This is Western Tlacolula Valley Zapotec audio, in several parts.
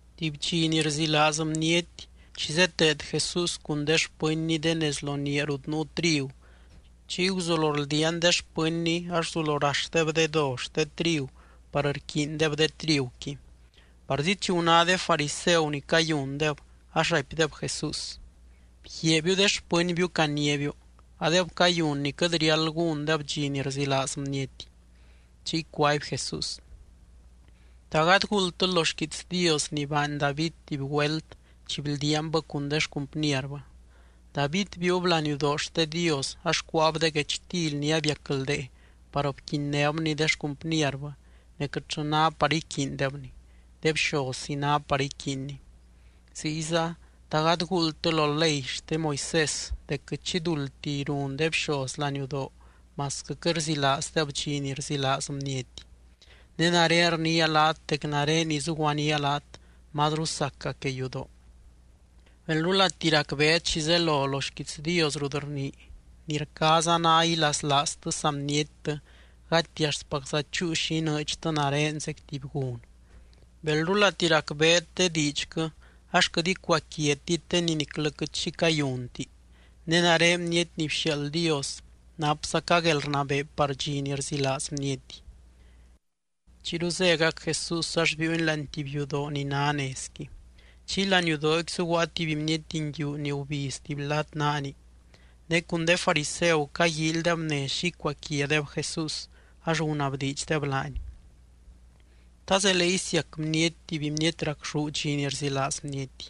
Tuby dxi ni rzilaaz bniety, chi zeteed Jesús cun de xpɨnny de nez lo niaa rut nuu trigu, chiy guzulo rldiaan de xpɨnny ax guzulo raxdeb de do xte trigu par rquiindeb de triguqui. Parzi chi guná de fariseu ni cayundeb, ax raipdeb Jesús: —Bguiaabiu de xpɨnbiu caniábiu, adeb cayun ni quɨt riáld gúndeb dxi ni rzilaaz bniety. Chiy cuaby Jesús: —¿Ta gady guuldtɨ lo xquiits Dios ni baany David tuby güelt chi bldiaanbɨ cun de xcumpnierbɨ? David biiub laniudoo xte Dios ax cuáab de guechtily ni abiacldee par bquinnébni de xcumpnierbɨ ne quɨtllɨ ná par iquiindebni, de bxozzi ná par iquiinni. Ziyza, ¿ta gady guuldtɨ lo ley xte Moisés dec quɨt xi duldtiy run de bxoz laniudoo masquɨ quɨt rzilaazdeb dxi ni rzilaaz bniety? Ne nare rniia laat dec nare ni zuguaníaa laat mazru saca que yudoo. Belrulati racbeet xi zelo lo xquiits Dios rut rnii: “Ni rcaaza ná ilaslaaztɨ saa bniettɨ gati axtpacza chúu xi inɨɨdxtɨ nare zec tuby gun.” Belrulati racbeet de diidxquɨ ax quɨt icuaquiatit de ni niclɨ quɨt xi cayunti. Ne nare Bniety ni bxiaald Dios napzaca guelrnabee par dxi ni rzilaaz bniety. Chiyru zégac Jesús ax biiuny láani tuby yudoo ni ná nezqui. Chiy laniudooqui zuguaa tuby bniety nguiu ni gubiz tuby lad naani. Ne cun de fariseu caguíilydeb nez xi icuaquiadeb Jesús ax gunabdiidxdeb laany: —¿Ta zelee isiac bniety tuby bniety racxú dxi ni rzilaaz bniety?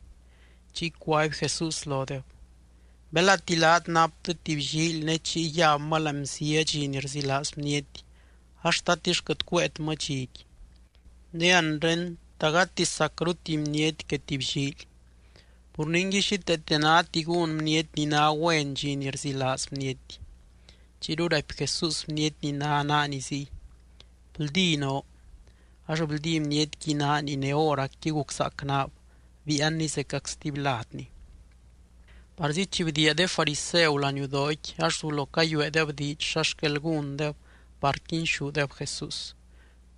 Chiy cuaby Jesús lodeb: —Belati laat naptɨ tuby llíily ne chiy yabmɨ láani bzia dxi ni rzilaaz bniety ax, ¿tatix quɨt cuéetmɨ dxiqui? Ne anre, ¿ta gati sacru tuby bniety que tuby llíily? Pur ningui xíteete náti gún bniety ni ná güen dxi ni rzilaaz bniety. Chiyru raipy Jesús bniety ni ná naani ziy: —Bldí noo. Ax bldí bnietqui naani ne hóracqui guczaac naab, biianni zecac stuby ladni. Parzi chi bdiia de fariseu laniudooqui, ax guzulo cayueedeb diidx xa xquel gúndeb par quinxúdeb Jesús.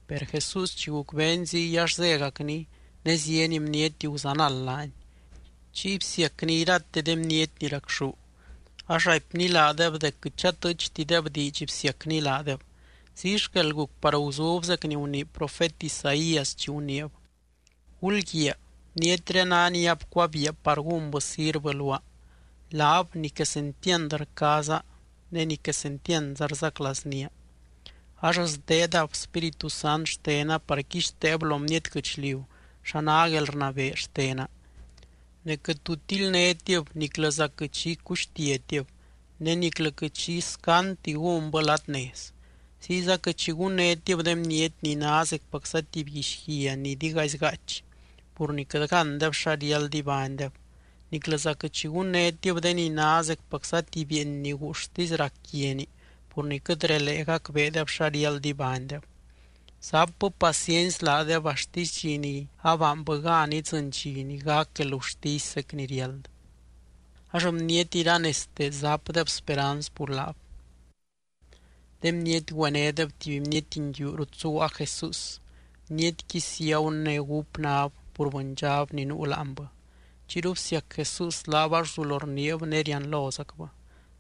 Per Jesús chi gucbeeny ziy ax zégacny ne zieny bniety guzanald laany. Chiy bsiacny irate de bniety ni racxú, ax raipny laadeb dec quɨt chatɨɨchtideb diidx bsiacny laadeb. Ziy xquel guc par guzub zec ni gunii profet Isaías, chi guniib: Gulguiaa, bnietré ná ni abcuabiia par gúnbɨ sirvɨ luaa, laab ni quesentiand rcaaza ne ni quesentiandza rzaclaaznía. Ax sdeedab Spíritu Sant xtena par quixteeb lo bniety guɨchliu xa ná guelrnabee xtena. Ne quɨt tu tildnétib niclɨza quɨt xi cuxtiatib ne niclɨ quɨt xi scandti gúnbɨ lad nez. Ziyza quɨt xi gunnétib de bniety ni ná zecpacza tuby guixguia ni digaizy gaachy pur ni quɨt gándeb xa riáld ibánydeb. Niclɨza quɨt xi gunnétib de ni ná zecpacza tuby bieeny ni guuxtisy rac quiani pur ni quɨt relee gacbeedeb xa riáld ibánydeb, zapbɨ paciency laadeb axtisy dxi ni abaanbɨ gan idzɨny dxi ni gac guelgurtisy zec ni riáld. Ax bniety iranezte zapdeb speranz pur laab. De bniety güenédeb tuby bniety nguiu rut zuguaa Jesús, bnietqui ciagu ne gúp náb pur bɨndxab ni nuu láanbɨ. Chiyru bsiac Jesús laab ax guzulo rniib ne rianlozacbɨ.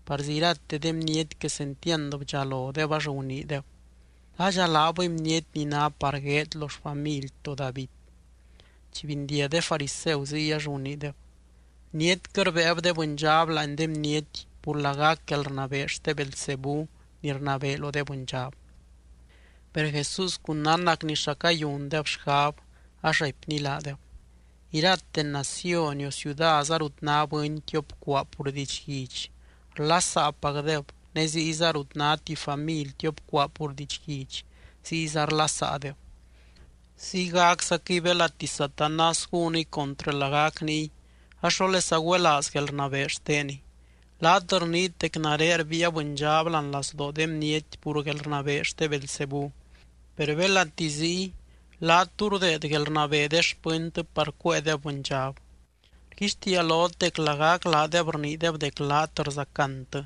Parzi irate de bniety quesentiand bdxalodeb ax guniideb: —¿Ladxa laabɨy bniety ni ná par gueed lo xfamily to David? Chi bindiag de fariseu ziy ax guniideb: —Bnietquɨ rbéeb de bɨndxab láani de bniety pur lagac guelrnabee xte Beelzebú ni rnabee lo de bɨndxab. Per Jesús cun nánnacny xa cayundeb xgab, ax raipny laadeb: —Irate naciony o ciudaza rut ná bɨny tiop cuaa pur didxguidx, rlasaapacdeb ne ziyza rut ná tuby family tiop cuaa pur didxguidx, ziyza rlasaadeb. Ziygaczaquɨy belati Satanás gúniy contrɨ lagac niy ax, ¿xólesa güelaaz guelrnabee xteniy? Laat rniit dec nare rbiia bɨndxab láani lazdoo de bniety pur guelrnabee xte Beelzebú, per belati ziy, laat, ¿tú rdeed guelrnabee de xpɨntɨ par cuéedeb bɨndxab? Rguixtiia lot dec lagac laadeb rniideb dec laat rzacantɨ.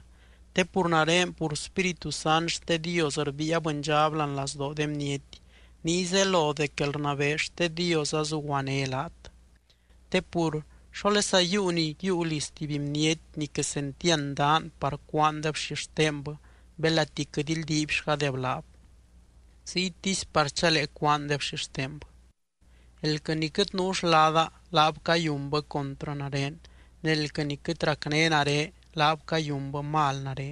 Te pur nare pur Spíritu Sant xte Dios rbiia bɨndxab láani lazdoo de bniety, niy zelo dec guelrnabee xte Dios azuguané laat. ’Te pur, ¿xólesa yiiu ni yiiu liz tuby bniety ni quesentiand daan par cúaandeb xixtenbɨ belati quɨt ildiibxgadeb laab? Ziytisy par chalee cúaandeb xixtenbɨ. ’Elquɨ ni quɨt nuu xlada, laab cayunbɨ contrɨ nare. Ne elquɨ ni quɨt racné nare, laab cayunbɨ mal nare.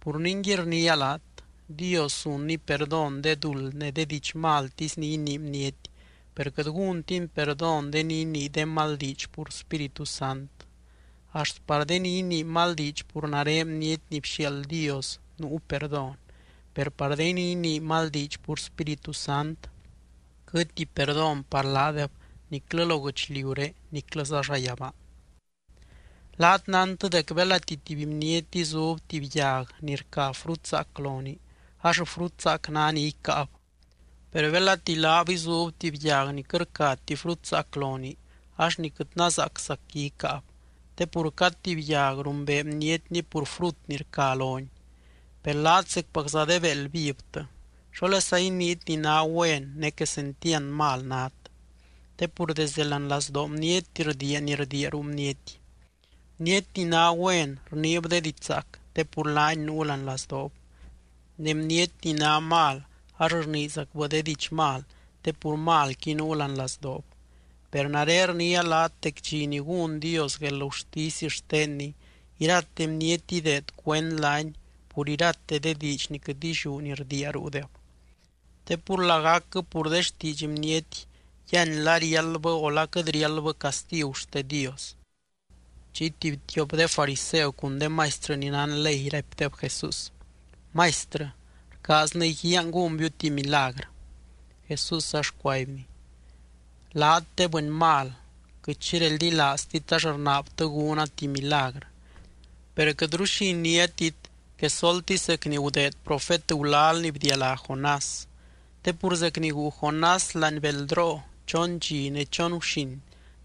’Pur ningui, rniia laat: Dios zunny perdón de duld ne de diidx maltisy ni inii bniety, per quɨt gúntiny perdón de ni inii de mal diidx pur Spíritu Sant. Axt par de ni inii mal diidx pur nare Bniety ni bxiaald Dios nuu perdón, per par de ni inii de mal diidx pur Spíritu Sant quɨtti perdón par laadeb niclɨ lo guɨchliuré niclɨza llayabaa. ’Laat nántɨ dec belati tuby bniety izub tuby yag ni rca frut zaac lonii ax frut zaac ná ni icáab, per belati laab izub tuby yag ni quɨt rcati frut zaac lonii ax ni quɨt nazaaczacqui icáab. Te pur cad tuby yag rumbee bnietni pur frut ni rca loni. ¡Per laat zecpacza de béeld vivtɨ! ¿Xólesa iniit ni ná güen ne quesentiand mal nát? Te pur desdɨ láani lazdoo bniety rdiia ni rdiia ruu bniety. Bniety ni ná güen rniib de diidx zaac te pur laani nuu láani lazdoob. Ne bniety ni ná mal ax rniizacbɨ de diidx mal te pur malqui nuu láani lazdoob. Per nare rniia laat dec dxi ni gún Dios guelgurtisy xtenny, irate bniety ideed cuend laany pur irate de diidx ni quɨt illiú ni rdiia ruudeb. Te pur lagacquɨ pur de xtiidx bniety yíany la riáldbɨ o la quɨt riáldbɨ castigu xte Dios. Chiy tuby tiop de fariseu cun de maistrɨ ni nán ley raipdeb Jesús: —Maistrɨ, rcaaznɨ iguiaan gúnbiu tuby milagrɨ. Jesús ax cuaibny: —Laat, de bɨny mal, quɨt xi reldilaaztit ax rnaabtɨ gúna tuby milagrɨ. Per quɨtru xi iniátit, quesoltisy zec ni gudeed profet gulal ni bdialá Jonás. Te pur zec ni guu Jonás láani beldroo, chon dxi ne chon guxin,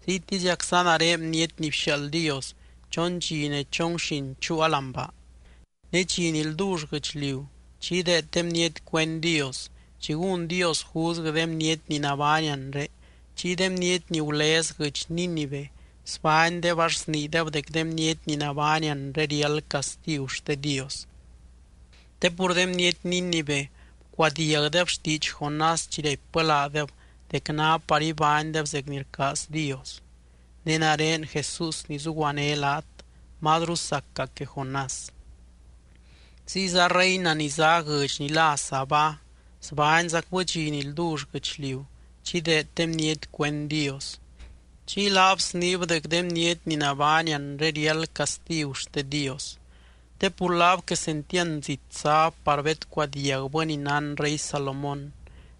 ziytiziacza nare Bniety ni bxiaald Dios, chon dxi ne chon guxin chuua láani baa. Ne dxi ni ldull guɨchliu chi ideed de bniety cuend Dios, chi gún Dios juzguɨ de bniety ni nabány anre, chiy de bniety ni gulez guɨdx Nínive sbánydeb ax sniideb dec de bniety ni nabány anre riáld castigu xte Dios. Te pur de bniety Nínive bcuadiagdeb xtiidx Jonás chi raipbɨ laadeb dec ná par ibánydeb zec ni rcaaz Dios. Ne nare Jesús ni zuguané laat, mazru saca que Jonás. Ziyza reina ni zá guɨdx ni lá Sabá sbányzacbɨ dxi ni ldull guɨchliu chi ideed de bniety cuend Dios, chiy laab sniib dec de bniety ni nabány anre riáld castigu xte Dios. Te pur laab quesentiand zit záb par bedcuadiagbɨ ni nán rey Salomón.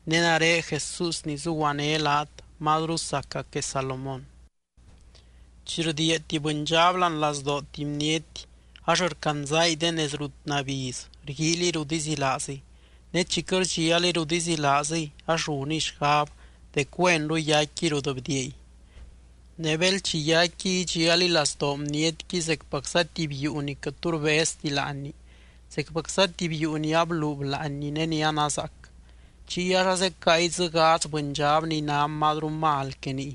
Ne nare Jesús ni zuguané laat, mazru saca que Salomón. ’Chi rdiia tuby bɨndxab láani lazdoo tuby bniety, ax rcandzangui de nez rut nabiz rguíiliy rut izilaaziy. Ne chi quɨt rdxialiy rut izilaaziy ax runiy xgab dec güenru yaicquiy rut bdiiay. Ne bel chi yaicquiy idxialiy lazdoo bnietqui zecpacza tuby yuu ni quɨt tu rbezti láanni, zecpacza tuby yuu ni ablub láanni ne ni anazaac. Chiy ax azecáangui dzɨ gadz bɨndxab ni ná mazru mal que niy.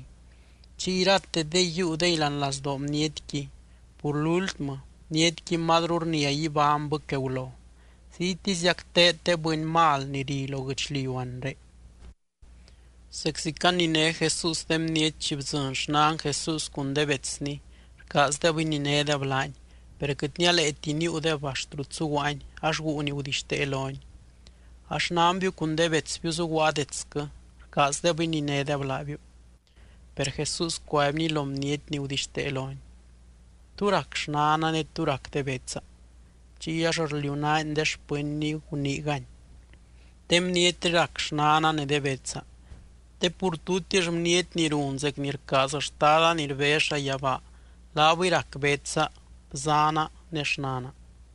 Chiy iratedengui yiiudengui láani lazdoo bnietqui. Pur lúltmɨ, bnietqui mazru rnia ibánybɨ que gulo. Ziytiziac teed de bɨny mal ni ri lo guɨchliu anre. Zeczi caniné Jesús de bniety chi bdzɨny xnan Jesús cun de betsny, rcaazdeb ininédeb laany. Per quɨt nialeeti níiudeb axt rut zuguaany ax guu ni gudixtee lony: —A xnanbiu cun de betsbiu zuguaa detsquɨ, rcaazdeb ininédeb laabiu. Per Jesús cuaibny lo bniety ni gudixtee lony: —¿Tú rac xnana ne tú rac de betsa? Chiy ax rliunaany de xpɨnny guniigany: —De bnietré rac xnana ne de betsa. Te pur tutix bniety ni run zec ni rcaaz Xtada ni rbez llayabaa, laabɨy rac betsa, bzaana ne xnana.